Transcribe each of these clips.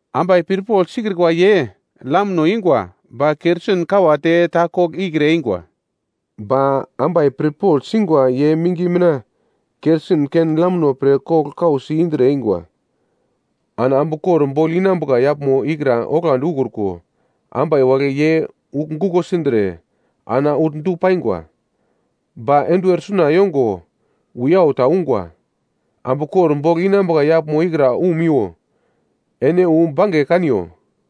Ambai pirpogl sikrikwa ye lamno ingwa, ba kerosin kawate ta kogl ikre eingwa. Ba ambai pirpogl singwa ye mingi mina kerosin ken-lamno pre kogl kausi indre eingwa. Ana ambu kor bogl inambuka yaglmo ikra oglandi ukruko, ambai wagle ye ugl guko sindre ana ugl du paingwa. “Ba enduwer suna yongo wiyau ta ungwa, ‘Ambu kor bogl inambuka yaglmo ikra umiwo. Ene wu bange kaniyo!’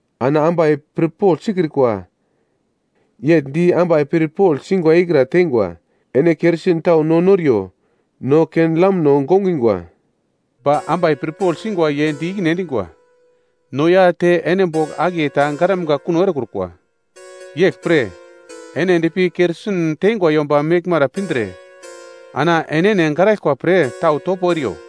Ana ambai pirpogl sikrikwa, yegl di ambai pirpogl singwa ikra teingwa, ‘Ene kerosin tau no noriyo, no ken-lamno gongingwa.’ “Ba ambai pirpogl singwa ye di ikine endingwa, ‘No ya te ene bogl akiye ta garamga kuno erekrukwa. Yeglpre, ene endpi kerosin teingwa yomba meglmara pindre ana enene garaglkwa pre tau topo eriyo.’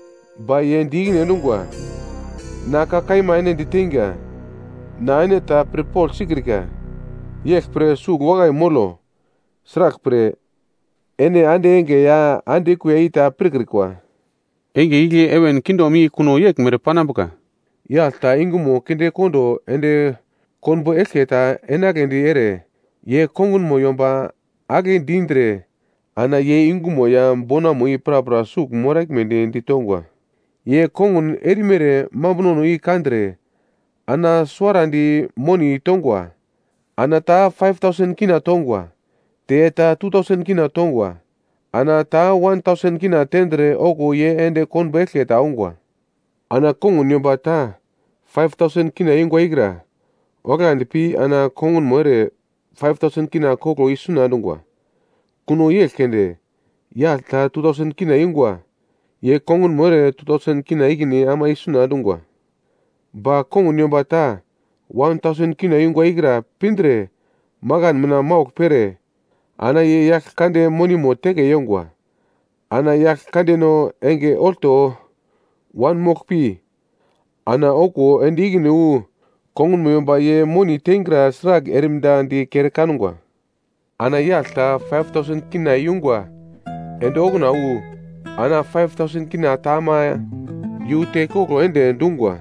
“Ba ye di ikine endungwa, ‘Na ka kaima ene diteinga, na ene ta pirpogl sikrika.’ “Yeglpre, sugl wakai molo. Sraglpre, ene ande enge ya ande kuiya i ta pirkrikwa. “Enge igle heven kingdom i kuno yeglmere panambuka. Yagl ta yungumo kindekondo ende konbo eglke ta enagledi ere, ye kongunmo yomba agle dindre ana ye yungumo ya bonamo i prapra sugl moraglmedi ditongwa. Ye kongun erimere mambunono i kandre, ana suwarandi moni tongwa. Ana ta K5,000 tongwa, te ta K2,000 tongwa, ana ta K1,000 tendre okuwo ye ende konbo eglke ta ongwa. Ana kongun yomba ta K5,000 yungwa ikra oglandi pi ana kongunmo ere K5,000 koglo isuna endungwa. Kuno yegl keunde, yagl ta K2,000 yungwa, ye kongunmo ere K2,000 ikine ama isuna endungwa. Ba kongun yomba ta K1,000 yungwa ikra pindre, makan mina maugl pere ana ye yagl kande monimo teke yongwa. “Ana yagl kandeno enge olto wanmoglpi, ana okuwo ende ikine wu kongunmo yomba ye moni teingra sragl erimda di kere kangwa. Ana yagl ta K5,000 yungwa ende okuna wu, ana K5,000 ta ama yu te koglo ende dungwa,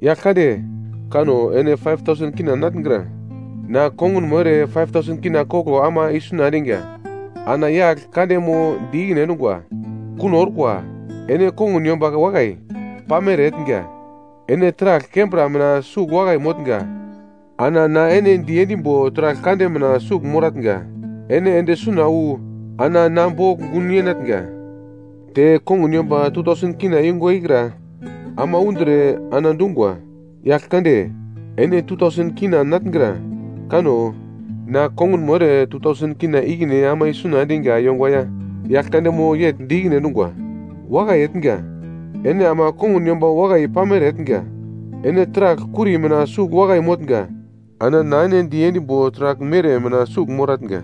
‘Yagl kande, kano ene K5,000 natngra. Na kongunmo ere K5,000 koglo ama isuna endinga.’ “Ana yagl kandemo di ikine endungwa, ‘Kuno orkwa. Ene kongun yomba wakai, pamere etnga. Ene taragl kembra mina sugl wakai motnga, ana na ene diendimbo taragl kande mina sugl moratnga. Ene ende suna wu, ana na bogl gun yenatnga.’ “Te kongun yomba K2,000 yungwa ikra ama undre ana dungwa, ‘Yagl kande, ene K2,000 natngra. Kanno, na kongunmo ere K2,000 ikine ama isuna endinga yongwa ya.’ “Yagl kandemo yegl di ikine endungwa, ‘Wakai etnga, ene ama kongun yomba wakai pamere etnga. Ene taragl kuri mina sugl wakai motnga, ana na ene diendimbo taragl mere mina sugl moratnga.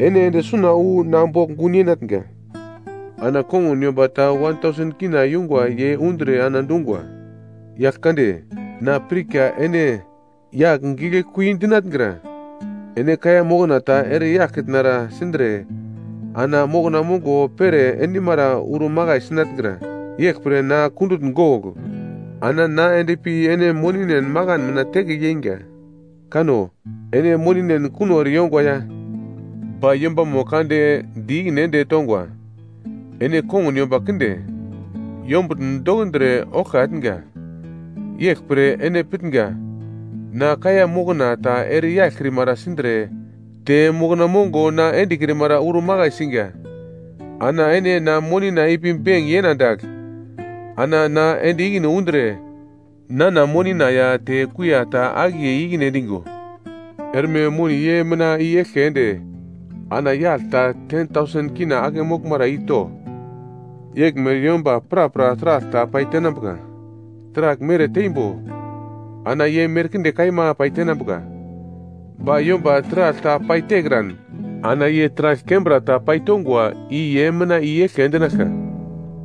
Ene ende suna wu na bogl gun yenatnga.’ “Ana kongun yomba ta K1,000 yungwa ye undre ana dungwa, ‘Yagl kande, na pirka ene yagl giglekui dinatngra. Ene kaiya mokna ta ere yaglkitnara sindre ana mokna mongo pere endimara uro makai sinatngra. Yeglpre na kundutn gogl, ana na endpi ene moninen makan mina teke yeinga. Kanno, ene moninen kuno ere yongwa ya.’ “Ba yombamo kande di ikine ende tongwa, ‘Ene kongun yomba kinde, yombutn dokundre oglka etnga. Yeglpre ene pitnga, na kaiya mokna ta ere yaglkrimara sindre, te mokna mongo na endekrimara uro makai singa. Ana ene na monina ipi benk yena dagl, ana na ende ikine undre, nana monina ya te kuiya ta akiye i-ikine endingo. “‘Erme moni ye mina i-eglke ende ana yagl ta K10,000 ake moglmara i to. Yeglmere yomba prapra taragl ta pai tenambuka, taragl mere teimbo ana ye merkinde kaima paitenambuka, ba yomba taragl ta paitekran, ana ye taragl kembra ta ye paitongwa i ye mina i-eglke endinaglka.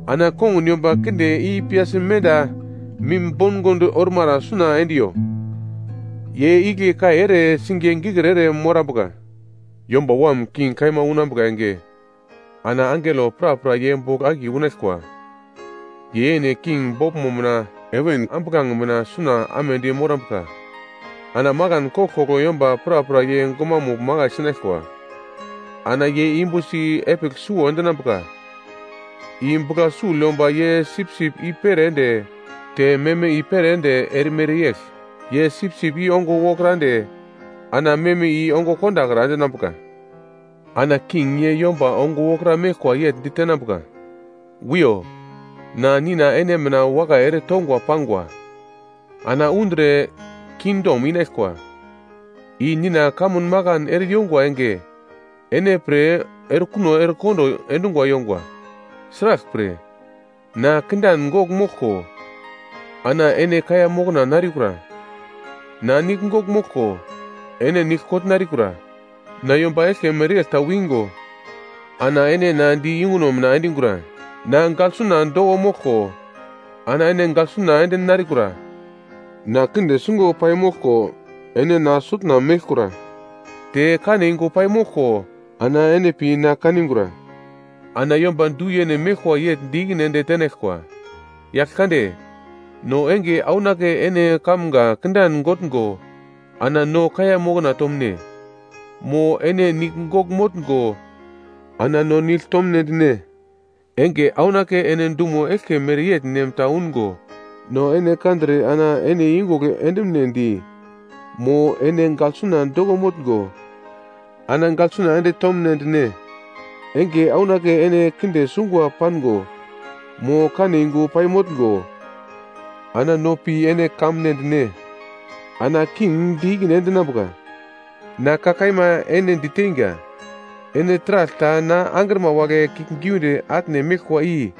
Ana kongun yomba kinde i piyasi menda mim bongond ormara suna endiyo, ye igle kai ere singiye gikir ere morambuka.’ “Yomba Wam king kaima unambuka enge ana angelo prapra ye bogl akiye unaglkwa, ye yene king boglmo mina heven ambuglange mina suna amedi morambuka. Ana makan koglkoglo yomba prapra ye gumamugl makai sinaglkwa. Ana ye yumbusi epigl suwo endinambuka, i bugla sugl yomba ye sipsip i-pere ende te meme i-pere ende erimere yegl. Ye sipsip i ongo wokra ende ana meme i ongo kondakra endinambuka. “Ana King ye yomba ongo wokra meglkwa yegl ditenambuka, ‘Wiyo, na Nina ene mina wakai ere tongwa pangwa. Ana undre kingdom inaglkwa, i Nina kamun makan ere yongwa enge ene pre erekuno erekondo endungwa yongwa. Sraglpre, na kindan gogl moglko ana ene kaiya mokna narikura. Na nigl gogl moglko ene nigl kogl narikura. Na yomba eglke mereyegl ta wingo ana ene na di yunguno mina endingura. Na gaglsuna doko moglko ana ene gaglsuna ende narikura. Na kinde sungo paimoglko ene na sutna meglkura, te kane yungu pai moglko ana ene pi na kanigura.’ “Ana yomba du-yene meglkwa yegl di-ikine ende tenaglkwa, ‘Yaglkande, no enge aunake ene kanumga kindan gotngo ana no kaiya mokna tomune mo ene nigl gogl motngo ana no nigl tomnedi ne? Enge aunake ene dumo eglke mereyegl nem ta ungo no ene kandre ana ene iyungugl endumunedi mo ene gaglsuna doko motngo ana gaglsuna ende tomnedi ne? Enge aunake ene kinde sungwa pango, mo kane yungu paimotngo, ana no pi ene kanmunedi ne.’ “Ana king di ikine endinambuka, ‘Na ka kaima ene ditenga, ene taragl ta na angrima wagle kiuglgiunde atne meglkwa i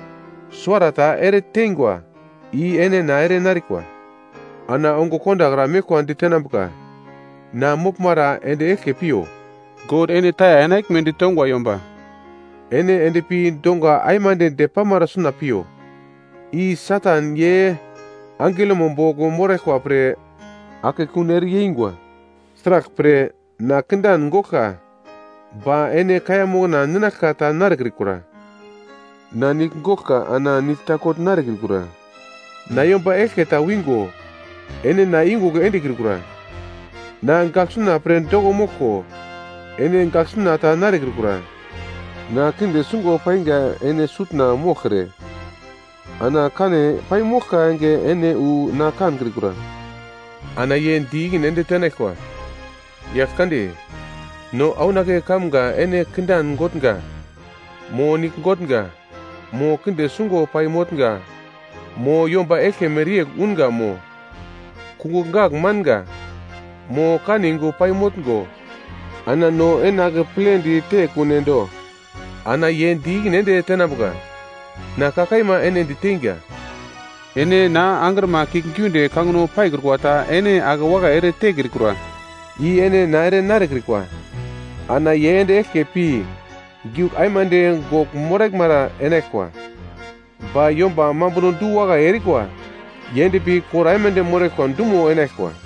suwarata eretengwa, i ene na ere narikwa.’ “Ana ongo kondakra meglkwa ditenambuka, ‘Na moglmara ende eglke piyo, God ene taya enaglme ditongwa yomba. Ene endpi donga aimande depamara suna piyo, i Satan ye angelomo bogl moraglkwa pre ana akekun ere yeingwa. Sraglpre, na kindan goglka, ba ene kaiya mokna ninaglka ta narekrikura, na nigl goglka ana nigl ta kogl narekrikura. Na yomba eglke ta wingo ene na iyungugl endekrikura, na gaglsuna pre doko moglko ene gaglsuna ta narekrikura. Na kinde sungwa painga ene sutna moglkre, ana kane pai moglka enge ene wu na kankrikura.’ “Ana ye di ikine ende tenaglkwa, ‘Yaglkande, no aunake kamga ene kindan gotnga, mo nigl gotnga, mo kinde sungwa pai motnga mo, yomba eglke mereyegl unga mo, kungugl gagl manga, mo kane yungu pai motngo, ana no ene akepledi tekune do?’ “Ana ye di ikine ende tenambuka, ‘Na ka kaima ene diteinga, ene na angrima kiuglgiunde kangino paikrukwa ta ene akewakai ere tekrikura, i ene na ere narekrikwa.’ “Ana ye ende eglke pi giugl aimande gogl moraglmara enaglkwa, ba yomba mambuno du-wakai erikwa ye endpi kor aimande moraglkwa dumo enaglkwa.”